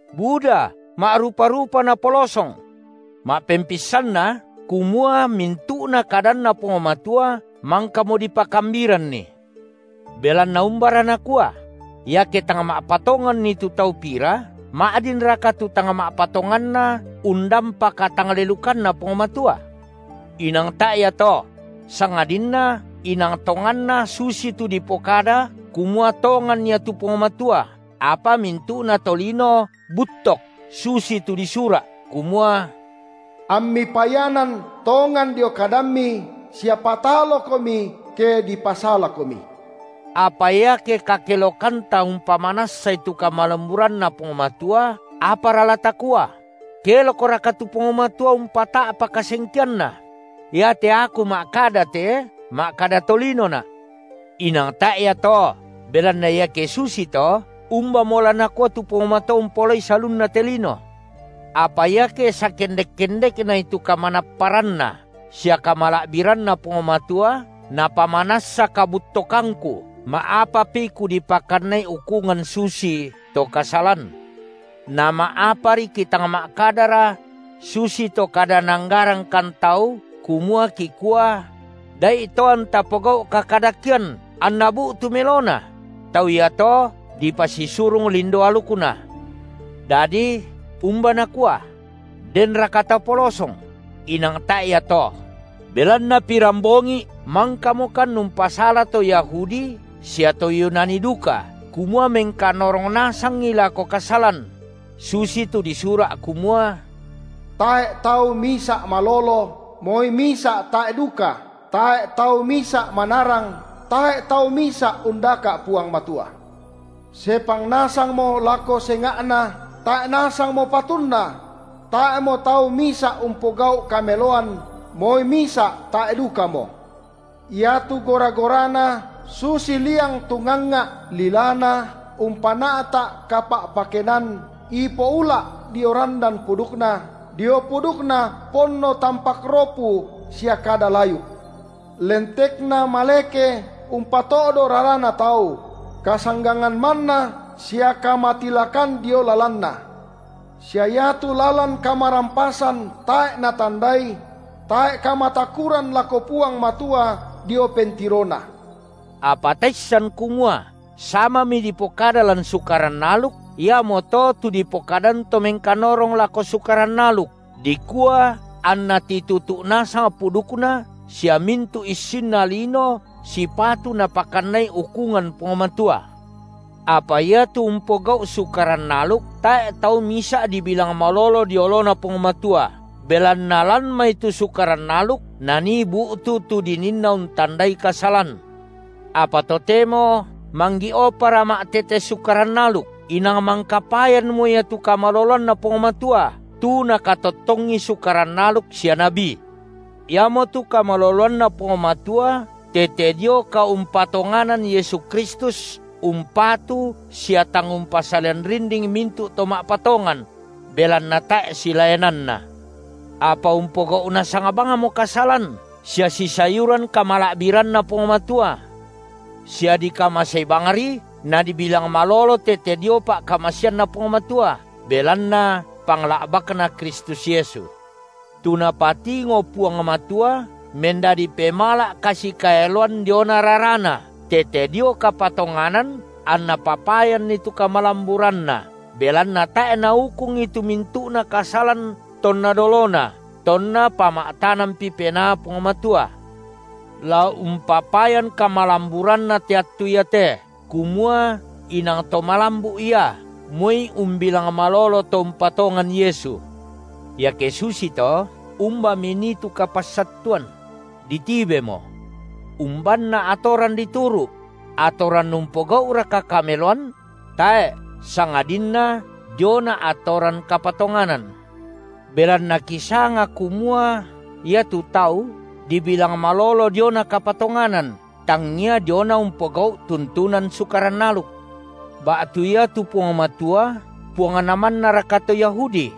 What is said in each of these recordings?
Buda, ma’rupa-rupa napolosong. Ma’pempissanna kumua mintu’na kadanNa Puang Matua mangkamo dipakambiranni. Belanna umbara nakua? Iake tang ma’patonganni tu tau pira, ma’dinraka tu tang ma’patonganna undampa katanglelukanNa Puang Matua? Inang tae’ ia to! Sangadinna inang tonganna susitu dipokada kumua tongan Ia tu Puang Matua, apa mintu’na tolino buttok, susi tu disura’ kumua: AmMi payanan tongan dio kadamMi sia pataloKomi ke dipasalaKomi. Apa iake kakelokanta umpamanassai tu kamalamburanNa Puang Matua, apara la takua? Kelokraka tu Puang Matua umpata’pa kasengkeanNa? iate aku ma’kada te, ma’kada tolinona’. Inang tae’ ia to! Belanna iake susito, umbamo la Nakua tu Puang Matua umpaolai salunna te lino? Apa iake sakendek-kendeknai tu kamanapparanNa sia kamala’biranNa Puang Matua napamanassa kabuttokangku, ma’apapi kudipakannai ukungan susito kasalan? Nama’apari kitang ma’kadara – susito kada naanggarangkan tau, kumua kikua: – Da’ito anta pogau’ kakadakean, anna bu’tu melona? Tau iato dipasisurung lindo alukna. Dadi umba nakua? Denraka tapolosong? Inang tae’ ia to; belanna pirambongi’ mangkamokan umpasala to Yahudi sia to Yunani duka kumua mengkanorong nasangi lako kasalan; susitu disura’ kumua: Tae’ tau misa’ malolo, moi misa’ tae’ duka, tae’ tau misa’ manarang, tae’ tau misa’ undaka’ Puang Matua; sepang nasangmo lako senga’na, tae’ nasangmo patunna; tae’mo tau misa’ umpogau’ kameloan, moi misa’ tae’ dukamo; iatu gora-gorana susi liang tungangnga’, lilana umpana’ta’ kapa’pakenan, ipo ula’ dio randan pudukna, dio pudukna ponno tampak ropu sia kada layuk. Lentekna maleke umpato’do rarana tau; kasanggangan manna sia kamatilakan dio lalanna; sia iatu lalan kamarampasan tae’ natandai; tae’ kamatakuran lako Puang Matua dio pentirona. Apa taissan kumua samami dipokada lan Sukaran aluk, iamoto tu dipokadan to mengkanorong lako Sukaran aluk, dikua anna titutu’ nasang pudukna sia mintu’ issinna lino sipatu Napakannai ukungan Puang Matua. Apa iatu umpogau’ Sukaran aluk, tae’ tau misa’ dibilang malolo dio oloNa Puang Matua, belanna lan mai tu Sukaran aluk nanii bu’tu tu dininna untandai kasalan. Apa totemo manggi’opara ma’tete Sukaran aluk inang mangka payanmo ia tu kamaloloanNa Puang Matua, tu nakatottongi Sukaran aluk sia nabi, iamotu kamaloloanNa Puang Matua tete dio kaumpatonganan Yesu Kristus umpatu sia tang umpasalian rinding mintu’ to ma’patongan; belanna tae’ silaenanna. Apa umpogau’ nasang bangmo kasalan sia sisayuran kamala’biranNa Puang Matua, sia dikamasei bangri nadibilang malolo tete dio pa’kamaseanNa Puang Matua, belanna pangla’bakNa Kristus Yesu. Tu Napatingo Puang Matua mendadi pemala’ kasikaeloan diona raraNa, tete dio kapatonganan anNa papayanni tu kamalamburanNa belanna tae’ Naukungi tu mintu’na kasalan tonna dolona tonna pama’tanampi penaa Puang Matua, la umpapayan kamalamburanNa te attu iate, kumua inang To malambu’ Ia, moi umbilang malolo to umpatongan Yesu. Iake susito, umbami nii tu kapassattuan? Ditibemo. Umbanna atoran dituru’? Atoran umpogau’raka kameloan? Tae’, sangadinna diona atoran kapatonganan. Belanna kisanga kumua iatu tau dibilang malolo diona kapatonganan, tangia diona umpogau’ tuntunan Sukaran aluk. Ba’tu iatu Puang Matua Puangna mannaraka to Yahudi?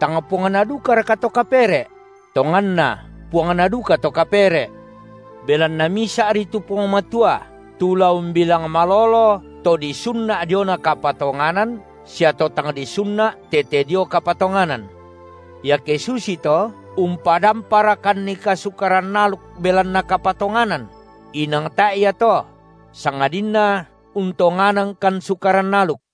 Tang Puangna dukaraka to kapere’? Tonganna, Puangna dukato kapere’. Belanna misa’ri tu Puang Matua, tu la umbilang malolo to disunna’ diona kapatonganan, sia to tang disunna’ tete dio kapatonganan. Iake susito, umpadamparakannika Sukaran aluk belanna kapatonganan? Inang tae’ ia to; sangadinna untonganangkan Sukaran aluk.